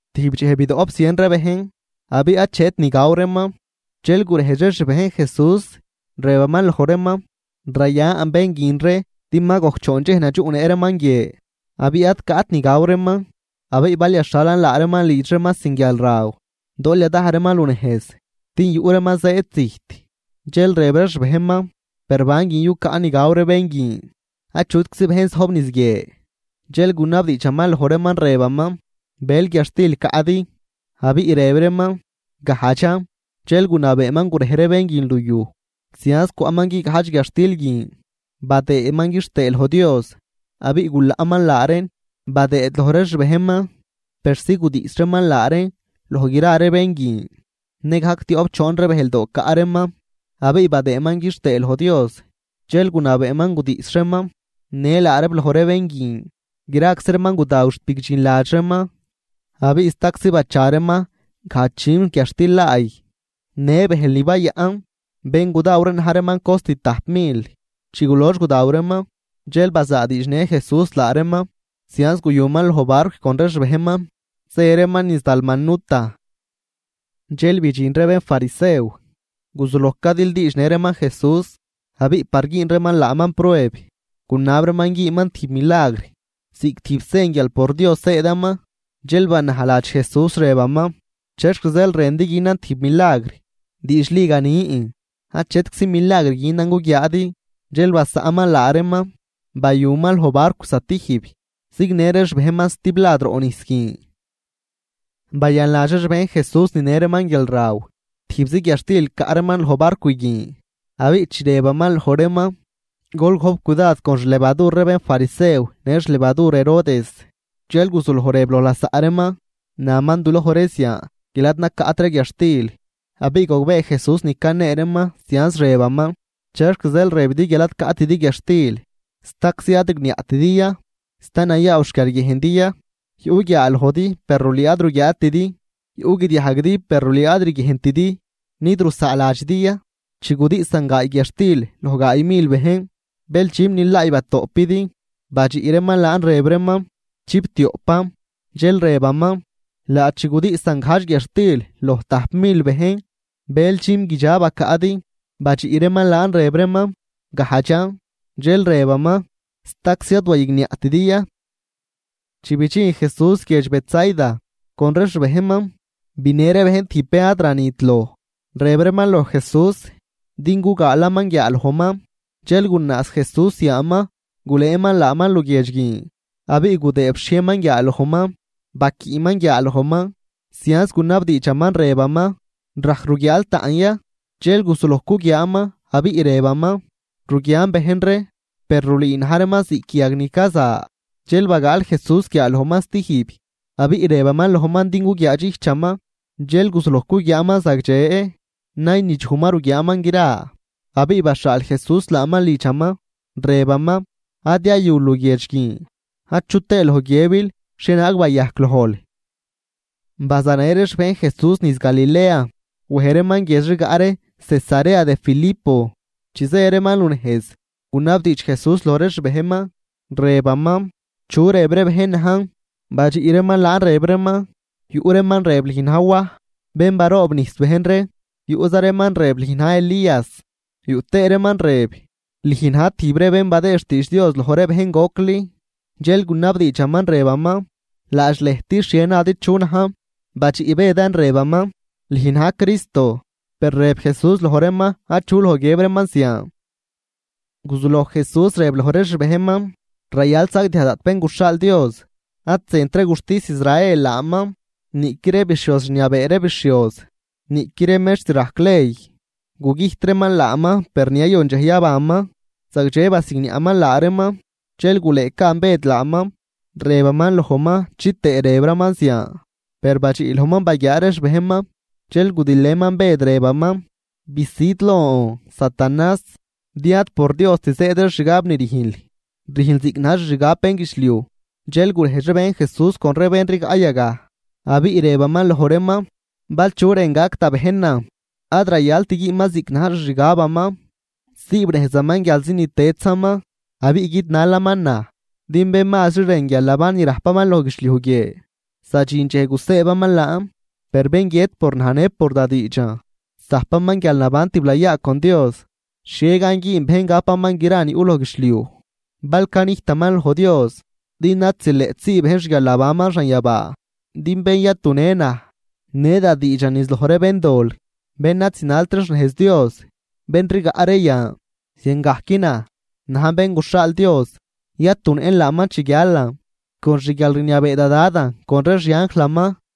Tijb dxej bidoꞌp zien ree bejn abiꞌ achet ni gaw reeman. Dxel gurejdx ree xbejn Jesús rëbaman loj reeman: ―Rayan bén guin ree din ma gojc choon dxej nadxuꞌnëꞌ reeman guie, abiꞌ ad caꞌt ni gaw reeman. Abiꞌ bal yaxhalan laa reeman lidx reeman sin guialraw, dool yadaj reeman lunejz, din yuꞌ reeman zëëd zijt. Dxel rëb ree xbejnman: ―Per, ¿ban guin yucaꞌn ni gaw ree bén guin, achutczi bejn zojb niz guie? Dxel gunabdiidxaman loj reeman rëbaman: ―¿Bël guiadxtil caꞌdi? Abiꞌ rëb reeman: ―Gajdxan. Dxel gunabeeman gurej ree bén guin luyuj. Zianz cwaꞌman guigajdx guiadxtil guin, badëëman quixtëë loj Dios, abiꞌ gulaꞌman laa reen badëëd loj ree xbejnman persi gudiꞌs reeman laa reen loj gra ree bén guin. Nëgajc tioꞌp choon ree bëjldoo caꞌ reeman, abiꞌ badëëman quixtëë loj Dios dxel gunabeeman gudiꞌs reeman në laa reeb loj ree bén guin. Graczi reeman gudaw xt bigdxinladx reeman, abiꞌ staczi bacha reeman gajdx dxüm guiadxtil laay në bëjl ni bayaꞌn. Bén gudaw ree na̱j reeman cost tajp mil. Chi gulox gudaw reeman, dxel bazaadiidxnë Jesús laa reeman. Zianz guyuman loj barcw con ree xbejnman zë reeman niz Dalmanuta. Dxel bidxin ree bénfarisew, guzuloj cadildiidxnë reeman Jesús, abiꞌ par güün reeman laaman prueb, gunab reeman güünman tijb milagr ziꞌc tijb sen guial por Dios zëëdaman. Dxel banajladx Jesús, rëbaman: ―¿Chexc zeel rëndi günan tijb milagr? Diidxli ganin, achetczi milagr günan guguiaadi. Dxel basaꞌnman laa reeman, bayuman loj barcw zatijb, zignë ree xbejnman stiblad roꞌ nijs guin. Bayanladx ree xbejn Jesús ninë reeman guialraw, tijbzi guiadxtil caꞌ reeman loj barcw guin. Abiꞌ chi rëbaman loj reeman: ―Gol gojp cudad con xlevadur ree bénfarisew në xlevadur Herodes. Dxel guzuloj rëb loj lasaꞌ reeman: ―Naman duloj ree zian guial ad nacaꞌt ree guiadxtil. Abiꞌ gogbee Jesús ni canee reeman, zianz rëbaman: ―¿Chexc zeel rëbidi guial ad caꞌtidi guiadxtil? ¿Staczi ad rigniaꞌtidi ya? ¿Sta nayaaw xquiarguiejndi ya? Yuꞌ guiaalojdi per rulüü ad ruguiaatidi, yuꞌ guidiajguidi per rulüü ad riguiejntidi. ¿Nid rusaaladxidi ya? Chi gudiꞌsan gaay guiadxtil loj gaay mil bejn, ¿bël dxüm ni laay batoꞌpidi? Badxiꞌ reeman laan rëb reeman: ―Chiptioꞌpan. Dxel rëbaman: ―Laadx chi gudiꞌsan gajdx guiadxtil loj tajp mil bejn, ¿bël dxüm guidxa bacaꞌdi? Badxiꞌ reeman laan rëb reeman: ―Gajdxan. Dxel rëbaman: ―¿Staczi ad waygniaꞌtidi ya? Chi bidxin Jesús guiedx Betsaida con ree xbejnman. Binë ree bejn tijb bén ad ranit loj, rëb reeman loj Jesús din gugaalaman guiaalojman. Dxel gunaaz Jesús yaaman gulëëman laaman luguiedx guin, abiꞌ gudëëb xhiejnman guiaalojman, baquiꞌman guiaalojman. Zianz gunabdiidxaman rëbaman: ―¿Rajc ruguiaal taꞌn ya? Dxel guzuloj cuguiaaman, abiꞌ rëbaman: ―Ruguian bejn ree, per rulüü na̱j reeman ziꞌc yag ni caza. Dxel bagaal Jesús guiaalojman stijb, abiꞌ rëbaman lojman din guguiaadxijchaman, dxel guzuloj cuguiaaman zagdxe, naynidxuj ma ruguiaaman gra. Abiꞌ baxhaal Jesús laaman lidxaman, rëbaman: ―Ad yayul luguiedx guin achu tëë loj guiëbil xhienaag bayajc lojl. Bazanë ree xbejn Jesús niz Galilea, wej reeman guiedx rigaꞌ ree Cesarea de Filipo. Chi zë reeman lunejz gunabdiidx Jesús loj ree xbejnman, rëbaman: ―¿Chu rëb ree bejn najn? Badxiꞌ reeman laan rëb reeman: ―Yuꞌ reeman rëb lüj na̱j Waj bén baroobnijs bejn ree, yuꞌza reeman rëb lüj na̱j Elías, yuꞌ tëë reeman rëb lüj na̱j tijb ree bén badëëd xtiidx Dios loj ree bejn gocli. Dxel gunabdiidxaman rëbaman: ―Laadx lëjt, ¿xhie nadi chu najn? Badxiꞌ Bëdan rëbaman: ―Lüj na̱j Cristo. Per rëb Jesús loj reeman achu loj guiëb reeman zian. Guzuloj Jesús rëb loj ree xbejnman: ―Rayal sagdiaj daꞌt Bén guxhaal Dios. Ad zënt ree guxtis Israel laaman, niꞌqui ree bixhioz rniabee ree bixhioz, niꞌqui ree mextr rajc ley. Gugüjt reeman laaman, per ni yayon dxej yabanman. Zagdxe basigniaꞌman laa reeman. Dxel gulëëcaan Bëd laaman, rëbaman lojman chitëë rëbraman zian. Per badxiꞌ lojman baguiaa ree xbejnman, dxel gudilëman Bëd rëbaman: ―¡Bisüd lon, Satanás!, din ad por Diost zëëd ree xgab ni rüjnl, rüjnl ziꞌc na̱j xixgab bénguidxliuj. Dxel gurejdx ree xbejn Jesús con ree bén rigaꞌ yagaj, abiꞌ rëbaman loj reeman: ―Bal chu rën gac da bejnan, ad rayalt güünman ziꞌc na̱j xixgabaman. Siibnejzaman guialzi ni tëdzaman abiꞌ guidnalaman naj. Din bén mazri rën guialnaban ni rajpaman loj guidxliuj guie, zadxin dxej gusëëbaman laan, per bén guiët por naj në por da diidxan, zajpaman guialnaban tiblayaa con Dios. ¿Xhie gan güün bejn gapaman gra ni yuꞌ loj guidxliuj bal canijtaman loj Dios? Din ad zileꞌt sii bejn xguialnabanman xanyabaa. Din bén yatunë naj në da diidxan niz loj ree béndol bén ad zinalt ree xnejz Dios, bén rigaꞌ ree yan, ziangajc naj, najn Bén guxhaal Dios, yatunëꞌn laaman chi guialan con xguialrniabee da Dadan con ree xianjlaman.